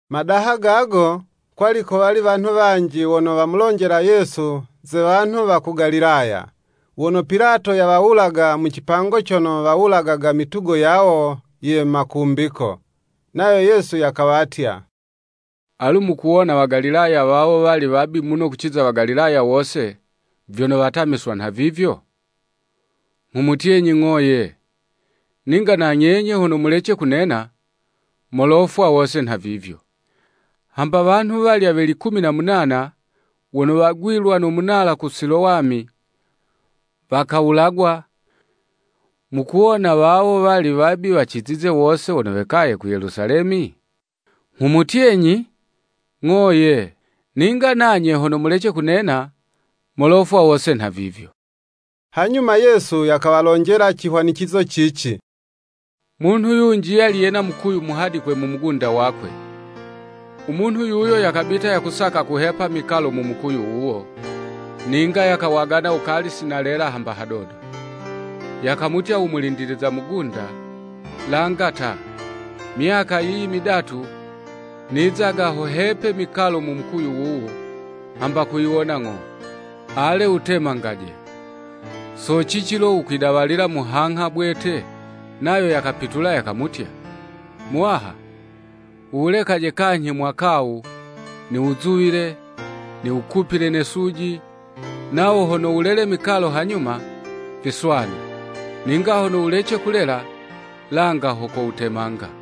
Madaha gago, kwali kowali wanhu wanji wono wamulonjela Yesu ze wanhu wa ku Galilaya, wono Pilato yawawulaga mu cipango cono wawulagaga mitugo yawo ye makumbiko. Nayo Yesu yakawatya, “Alu mukuwona Wagalilaya wawo wali wabi muno kuciza Wagalilaya wose, vyono watamiswa nhavivyo? Nghumutyenyi, ng'o, ye; ninga na nyenye hono mulece kunena, molofwa wose nhavivyo. Hamba wanhu walya we likumi na munana wono wagwilwa no munala ku Silowami, wakawulagwa, mukuwona wawo wali wabi, wacizize wose wono wekaye ku Yelusalemi? Nghumutyenyi, ng'o, ye, ninga nanye hono mulece kunena, molofwa wose nhavivyo.” Hanyuma Yesu yakawalonjela cihwanicizo cici. “Munhu yunji yali yena mukuyu muhadikwe mu mugunda wakwe; u munhu yuyo yakabita yakusaka kuhepa mikalo mu mukuyu wuwo, ninga yakawagana wukali si nalela hamba hadodo. Yakamutya u mulindiliza mugunda, langa ta, myaka yiyi midatu, nizaga ho hepe mikalo mu mukuyu wuwu, hamba kuyiwona ng'o, ale wutemangaje; so cici lo wukwidawalila muhangha bwete?” Nayo yakapitula yakamutya, “Muwaha, wuwulekaje kanyhi mwaka 'wu, niwuzuwile, niwukupile ne suji; nawo hono wulele mikalo hanyuma, viswanu; ninga hono wulece kulela, langa ho kowutemanga.”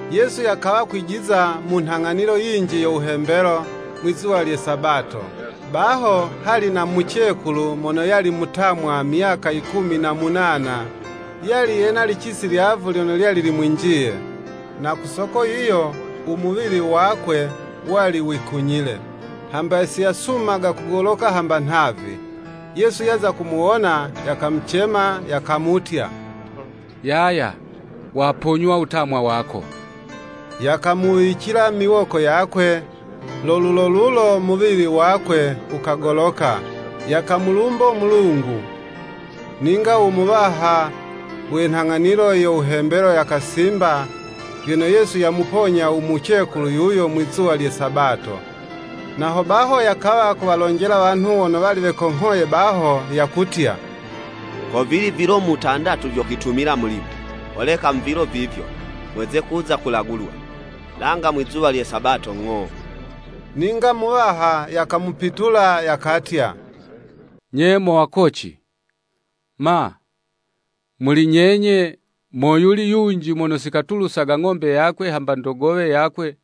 Yesu yakawa yakwijiza mu nhang'anilo yinji yo wuhembelo, mwizuwa lye Sabato. Baho hali na mucekulu mono yali mutamwa myaka yikumi na munana, yali yena licisi lyavu lyono lyali limwinjiye, na ku soko yiyo, u muwili wakwe yali yekunyile, hamba siyasumaga kugoloka hamba nhavi. Yesu yaza kumuwona yakamucema, yakamutya, “Yaya, waponywa wutamwa wako.” Yakamuwicila miwoko yakwe; lo lulo lulo muwili wakwe wukagoloka, yakamulumbo Mulungu. Ninga u muwaha we nhang'anilo yo wuhembelo yakasimba, vyono Yesu yamuponya u mucekulu yuyo mwi'zuwa lye Sabato, na ho baho yakawa kuwalonjela wanhu wono wali wekonghoye baho, yakutya, “Ko vili vilo mutandatu vyo kwitumila mulimo, holeka mu vilo vivyo, mweze kuza kulagulwa, langa mwizuwa lye sabato ng'o.” Ninga Muwaha yakamupitula, yakatya, “Nye mo wakoci, ma, muli nyenye, moyuli yunji mono si katulusaga ng'ombe yakwe hamba ndogowe yakwe,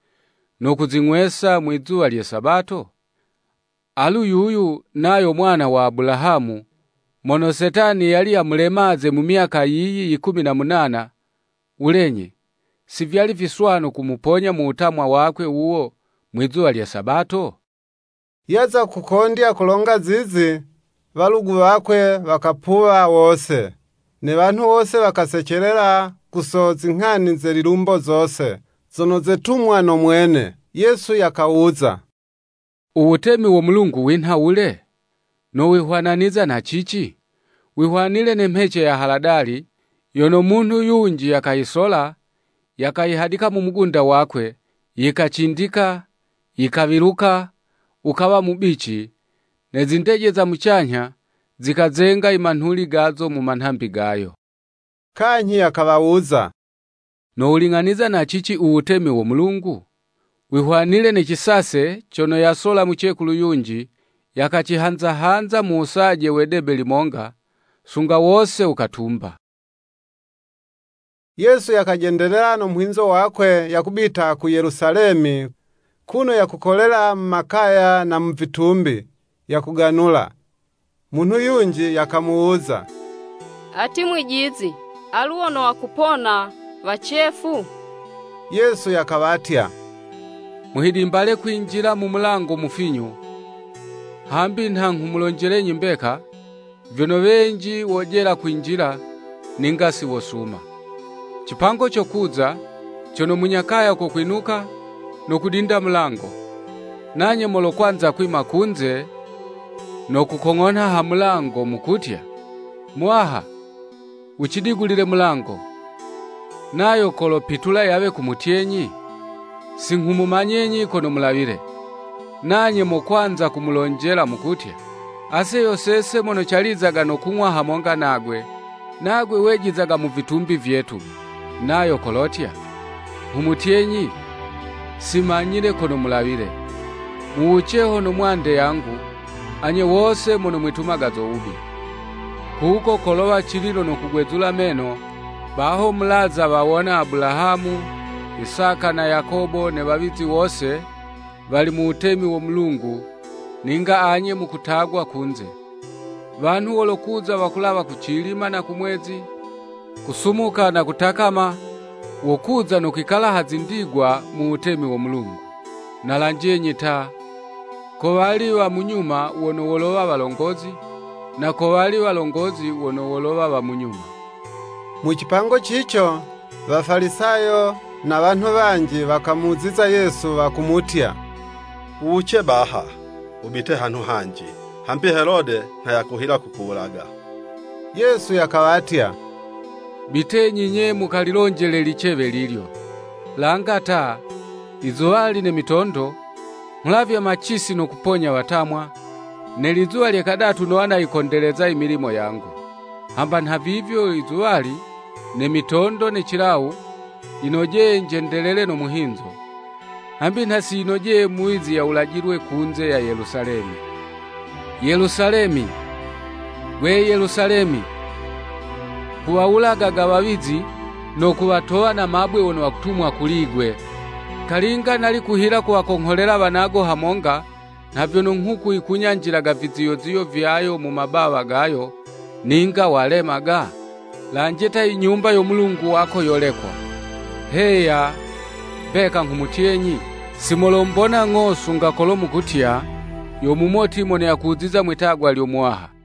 no kuzing'wesa mwizuwa lye sabato? Alu yuyu, nayo mwana wa Abulahamu, mono Setani yali yamulemaze mu myaka yiyi yikumi na munana, wulenyi, si vyali viswanu kumuponya mu wutamwa wakwe wuwo mwizuwa lye Sabato?” Yaza kukondya kulonga zizi, walugu wakwe wakapuwa wose; ne wanhu wose wakasecelela, ku so zinghani ze lilumbo zose, zono zetumwa no mwene. Yesu yakawuza; Uwutemi wo Mulungu winha wule? Nowihwananiza na cici? Wihwanile ne mhece ya Haladali, yono munhu yunji yakayisola, yakayihadika mu mugunda wakwe, yikacindika, yikawiluka, wukawa mubici, ne zindeje za mucanyha zikazenga i manhuli gazo mu manhambi gayo. Kanyhi yakawawuza, “Nowuling'aniza na cici U wutemi wo Mulungu? Wihwanile ne cisase cono yasola mucekulu yunji, yakacihanza hanza mu wusaje we 'debe limonga, sunga wose wukatumba.” Yesu yakajendelela no muhinzo wakwe yakubita ku Yelusalemi kuno yakukolela mu makaya na mu vitumbi, yakuganula. Munhu yunji yakamuwuza; “Ati Mwijizi, alu wono wakupona wacefu?” Yesu yakawatya, Muhidimbale kwinjila mu mulango mufinyu, hambi nha nghumulonjelenyi mbeka, vyono wenji wojela kwinjila, ninga si wosuma. Cipango cokuza, cono munya kaya kokwinuka, no kudinda mulango, nanye molokwanza kwima kunze, no kukong'onha ha mulango, mukutya, “Muwaha, wucidigulile mulango.” Nayo kolopitula yawe kumutyenyi, “Si nghumumanyenyi kono mulawile!” Nanye mokwanza kumulonjela, mukutya, “Ase yo sese mono calizaga no kung'wa hamonga nagwe, nagwe wejizaga mu vitumbi vyetu.” Nayo kolotya, “Nghumutyenyi, simanyile kono mulawile; muwuce hono mwande yangu, anye wose mono mwitumaga zo wubi.” Kuko kolowa cililo no kugwezula meno, baho mulaza wawona Abulahamu, Isaka na Yakobo ne wawizi wose, wali mu wutemi wo Mulungu, ninga anye mukutagwa kunze! Wanhu wolokuza wakulawa kucilima na kumwezi, kusumuka na kutakama, wokuza no kwikala ha zindigwa mu wutemi wo Mulungu. Na lanjenyi ta, kowali wa munyuma wono wolowa walongozi, na kowali walongozi wono wolowa wa munyuma. Mu cipango cico Wafalisayo na wanhu wanji wakamuziza Yesu, wakumutya, “Wuwuce baha wubite hanhu hanji: hambi Helode nha yakuhila kukuwulaga.” Yesu yakawatya “Bitenyi nye mukalilonjele licewe lilyo. Langa ta, izuwali ne mitondo, nghulavya macisi no kuponya watamwa, ne lizuwa lye kadatu nowa nayikondeleza i milimo yangu.” Hamba nhavivyo izuwali, ne mitondo ne cilawu, yinojeye njendelele no muhinzo; hambi nha si yinojeye muwizi yawulajilwe kunze ya Yelusalemi. “Yelusalemi! Gwe Yelusalemi! Kuwawulagaga wawizi, no kuwatowa na mabwe wono wakutumwa kuli'gwe! Kalinga nali kuhila kuwakongholela wanago hamonga, nha vyono nghuku yikunyanjilaga viziyoziyo vyayo mu mabawa gayo, ninga walemaga? Lanje ta i Nyumba yo Mulungu wako yolekwa. Heya, mbeka, nghumutyenyi, Si molombona ng'o sunga kolo mukutya, ‘Yo mumoti mono yakuziza mwitagwa lyo Muwaha.’”